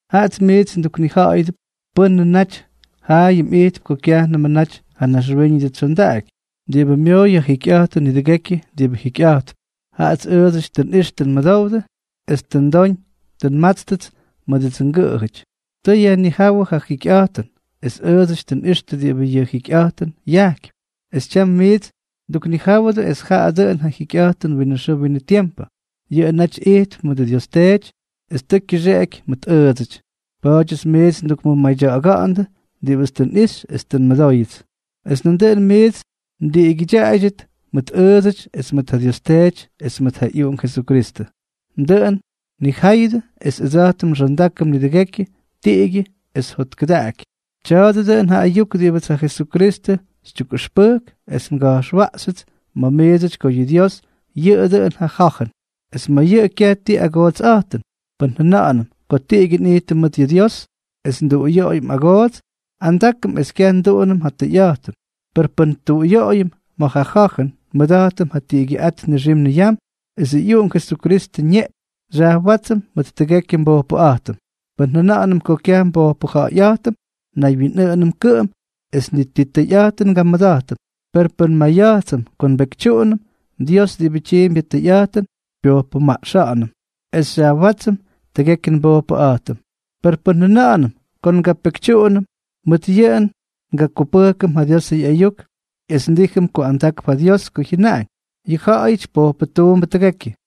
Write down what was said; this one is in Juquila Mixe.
Jaꞌats miits nduknija̱ꞌa̱yʉdʉp pʉ́nʉ naty jaayʉm ijtp ko kyajnʉmʉ naty ja naxwíñʉdʉ tsyondaꞌaky, diꞌibʉ myooy ja jikyꞌa̱jtʉn nidʉgekyʉ diꞌibʉ jikyꞌa̱jtp. Jaꞌats ʉʉdsʉty tʉ nꞌix tʉ nmʉdowdʉ es tʉ ndoñ tʉ nmátstʉts mʉdʉdsʉ ngʉꞌʉjʉty. Tʉ yajnijáwʉ yʉ jikyꞌa̱jtʉn, es ʉʉdsʉty tʉ nꞌixtʉ diꞌibʉ yʉ jikyꞌa̱jtʉn yajkypy, es tyam miits nduknijáwʉdʉ es jaꞌa dʉꞌʉn ja jikyꞌa̱jtʉn winʉ xʉʉ winʉ tiempʉ. Yʉꞌʉ naty ijtp mʉdʉ Dios Teety es tʉ kyʉxeꞌeky mʉt ʉʉdsʉty. Pa̱a̱dyʉts miits ndukmʉmadya̱ꞌa̱ga̱ꞌa̱ndʉ diꞌibʉts tʉ nꞌixy es tʉ nmʉdóyʉts, es nandʉꞌʉn miits mdiꞌigyʉdyaꞌaydyʉt mʉt ʉʉdsʉty es mʉt ja Dios Teety es mʉt ja ꞌyUꞌunk Jesukristʉ. Dʉꞌʉn nnijáyʉdʉ es ʉdsa̱jtʉm nxondákʉm nidʉgekyʉ tiꞌigyʉ es jotkʉdaꞌaky. Tya̱a̱dʉ dʉꞌʉn ja ayuk diꞌibʉts ja Jesukristʉ xytyukꞌʉxpʉjk es nga̱jxwaꞌxyʉts ma̱ miidsʉty ko yʉ Dios yʉꞌʉ dʉꞌʉn ja Ja̱jʉn, es ma̱ yʉꞌʉ kyaj ti agootsꞌa̱jtʉn. Pʉn jʉna̱ꞌa̱nʉm ko tiꞌigyʉ nꞌijtʉm mʉt yʉ Dios, es nduꞌuyoꞌoyʉm agoots, andákʉm es kyaj nduꞌunʉm ja tʉyꞌa̱jtʉn. Per pʉn tuꞌuyoꞌoyʉm ma̱ ja ja̱jʉn, nmʉda̱jtʉm ja tiꞌigyʉꞌát nixim niyam esʉ ꞌyUꞌunk Jesukristʉ ñeꞌpyñ xyajwátsʉm mʉt tʉgekyʉ nbojpʉꞌa̱jtʉm. Pʉn njʉna̱ꞌa̱nʉm ko kyaj nbojpʉja̱ꞌa̱yꞌa̱jtʉm, naywyinꞌʉꞌʉnʉm kʉꞌʉm es ni ti tʉyꞌa̱jtʉn ngamʉda̱jtʉm. Per pʉn maya̱jtsʉm ko nbekytyuꞌunʉm, Dios diꞌibʉ tyiimpy ja tʉyꞌa̱jtʉn, xypyojpʉmaꞌxa̱ꞌa̱nʉm es xyajwátsʉm tʉgekyʉ nbojpʉꞌa̱jtʉm. Per pʉn jʉna̱ꞌa̱nʉm ko ngapekytyuꞌunʉm, mʉt yʉꞌʉ ngakupʉjkʉm ja Diosʉ ꞌyayuk es ndíjʉm ko andakp ja Dios ko jyʉnaꞌañ: “Yʉ ja̱ꞌa̱yʉty pojpʉtuundʉbʉ tʉgekyʉ.”